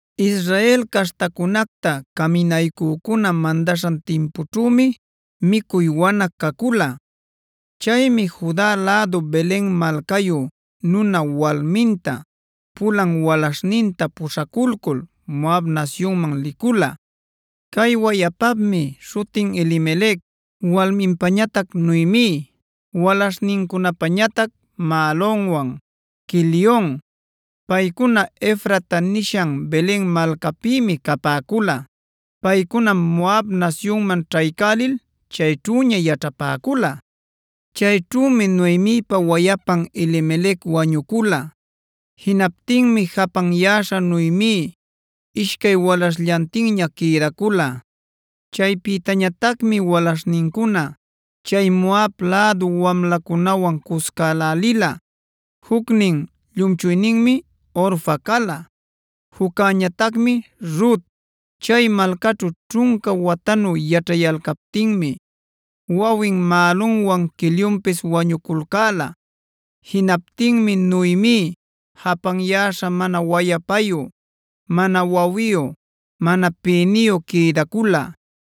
Israel caśhtacunacta caminaycücuna mandaśhan timpućhümi micuy wana cacula. Chaymi Juda lädu Belena malcayu nuna walminta, pulan walaśhninta puśhaculcul Moab nasyunman licula. Cay wayapapmi śhutin Elimelec, walminpañatac Noemi, walaśhnincunapañatac Mahlonwan, Quelion. Paycuna “Efrata” nishan Belen malcapïmi capäcula. Paycunam Moab nasyunman ćhaycälil chayćhüña yaćhapäcula. Chayćhümi Noemipa wayapan Elimelec wañucula. Jinaptinmi japanyäśha Noemi ishcay walaśhllantinña quïdacula. Chaypïtañatacmi walaśhnincuna chay Moab lädu wamlacunawan cuscälälila. Jucnin llumchuyninmi Orfa cala; juccäñatacmi Rut. Chay malcaćhu ćhunca watanu yaćhayalcaptinmi, wawin Mahlonwan Quelionpis wañuculcäla. Jinaptinmi Noemi japanyäśha mana wayapayu, mana wawiyu, mana pïniyu quïdacula.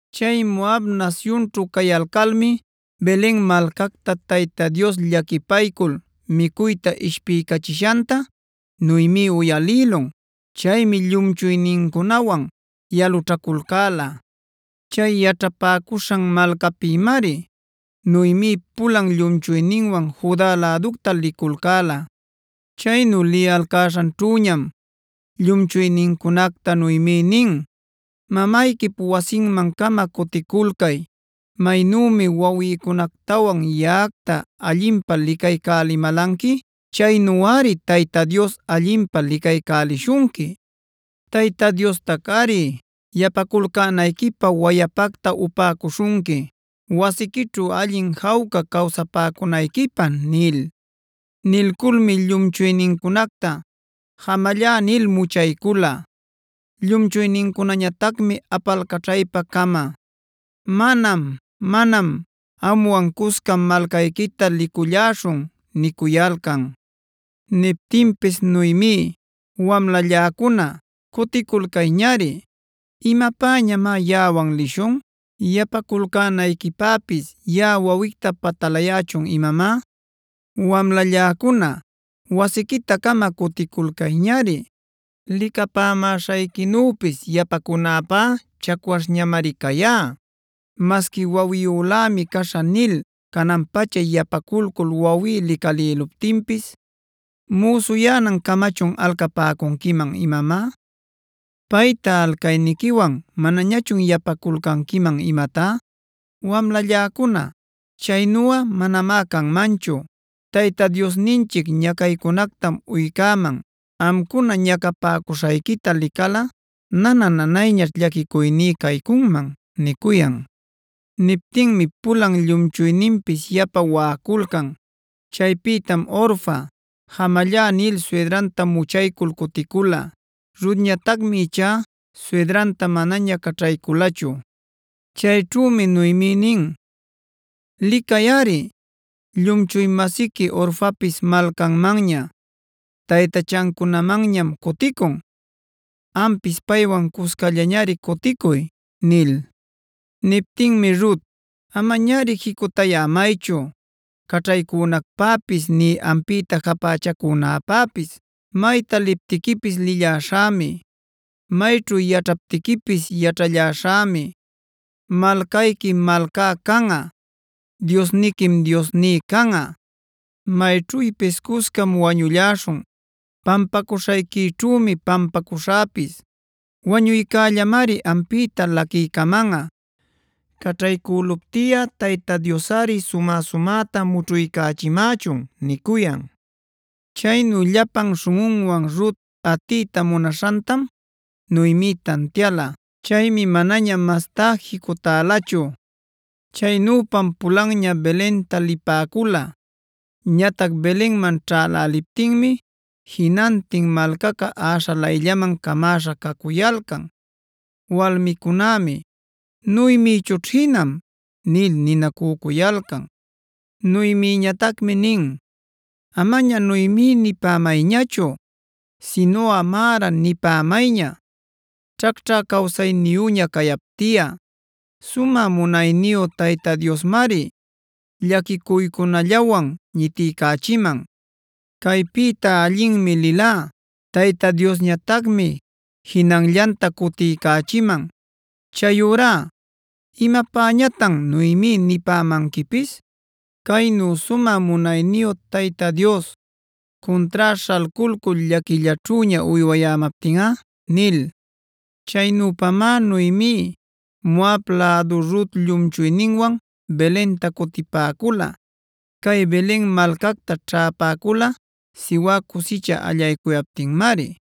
Chay Moab nasyunćhu cayalcalmi Belen malcacta Tayta Dios llaquipaycul micuyta ishpiycachishanta Noemi uyalïlun. Chaymi llumchuynincunawan yalućhaculcäla. Chay yaćhapäcuśhan malcapïmari Noemi pulan llumchuyninwan Juda läducta liculcäla. Chaynu liyalcäśhanćhüñam llumchuynincunacta Noemi nin: “Mamayquip wasinman-cama cuticulcay. Maynümi wawïcunactawan yaꞌacta allinpä licaycälimälanqui, chaynuꞌari Tayta Dios allinpä licaycälishunqui. Tayta Diostacꞌari yapaculcänayquipä wayapacta upäcuśhunqui, wasiquićhu allin jawca cawsapäcunayquipä” nil. Nilculmi llumchuynincunacta jamallá nil muchaycula. Llumchuynincunañatacmi apalcaćhaypa-cama: “¡Manam, manam! Amwan cuscam malcayquita liculläśhun” nicuyalcan. Niptinpis Noemi: “Wamlalläcuna, cuticulcayñari. ¿Imapäñamá yaꞌawan lishun? ¿Yapaculcänayquipäpis yaꞌa wawicta patalayächun imamá? ¡Wamlalläcuna, wasiquita-cama cuticulcayñari! Licapämäśhayquinüpis yapacunäpá chacwaśhñamari cayá. Masqui ‘wawiyülämi caśhä’ nil canan-pacha yapaculcul wawí licalïluptinpis, ¿müsuyänancamachun alcapäcunquiman imamá? ¿Payta alcayniquiwan manañachun yapaculcanquiman imatá? Wamlalläcuna, chaynuꞌa manamá canmanchu. Tayta Diosninchic ñacaycunactam uycäman; amcuna ñacapäcuśhayquita licalꞌa nana-nanayñaćh llaquicuyní caycunman” nicuyan. Niptinmi pulan llumchuyninpis yapa waꞌaculcan. Chaypïtam Orfa “jamallá” nil suydranta muchaycul cuticula. Rutñatacmi ichá suydranta manaña caćhayculachu. Chayćhümi Noemi nin: “Licayꞌari, llumchuy-masiqui Orfapis malcanmanña, taytachancunamanñam cuticun. Ampis paywan cuscallañari cuticuy” nil. Niptinmi Rut: “¡Amañari jicutayämaychu caćhaycunacpäpis nï ampïta japächacunäpäpis! Mayta liptiquipis lilläśhämi; mayćhu yaćhaptiquipis yaćhalläśhämi. Malcayquim malcá canꞌa; Diosniquim Diosní canꞌa. Mayćhüpis cuscam wañulläśhun; pampacuśhayquićhümi pampacuśhäpis. Wañuycällamari ampïta laquiycamanꞌa. Caćhaycüluptiꞌa Tayta Diosꞌari sumä-sumäta mućhuycachimächun” nicuyan. Chaynu llapan śhunꞌunwan Rut atiyta munaśhantam Noemi tantiala. Chaymi manaña mastá jicutälachu. Chaynüpam pulanña Belenta lipäcula. Ñatac Belenman ćhäläliptinmi jinantin malcaca äśhalayllaman camäśha cacuyalcan. Walmicunämi: “¿Noemichućh jinam?” nil ninacücuyalcan. Noemiñatacmi nin: “Amaña Noemib nipämayñachu sinuꞌa Marac nipämayña, ćhacćhä cawsayniyüña cayaptiꞌa. Sumä munayniyu Tayta Diosmari llaquicuycunallawan ñitiycachiman. Caypïta allinmi lilá; Tayta Diosñatacmi jinanllanta cutiycächiman. Chayurá ¿imapäñätan ‘Noemi’ nipämanquipis, caynu sumä munayniyu Tayta Dios cuntrá śhalculcul llaquillaćhüña uywayämaptinꞌa?” nil. Chaynüpamá Noemi Moab lädu Rut llumchuyninwan Belenta cutipäcula. Cay Belen malcacta ćhäpäcula siwä cusicha allaycuyaptinmari.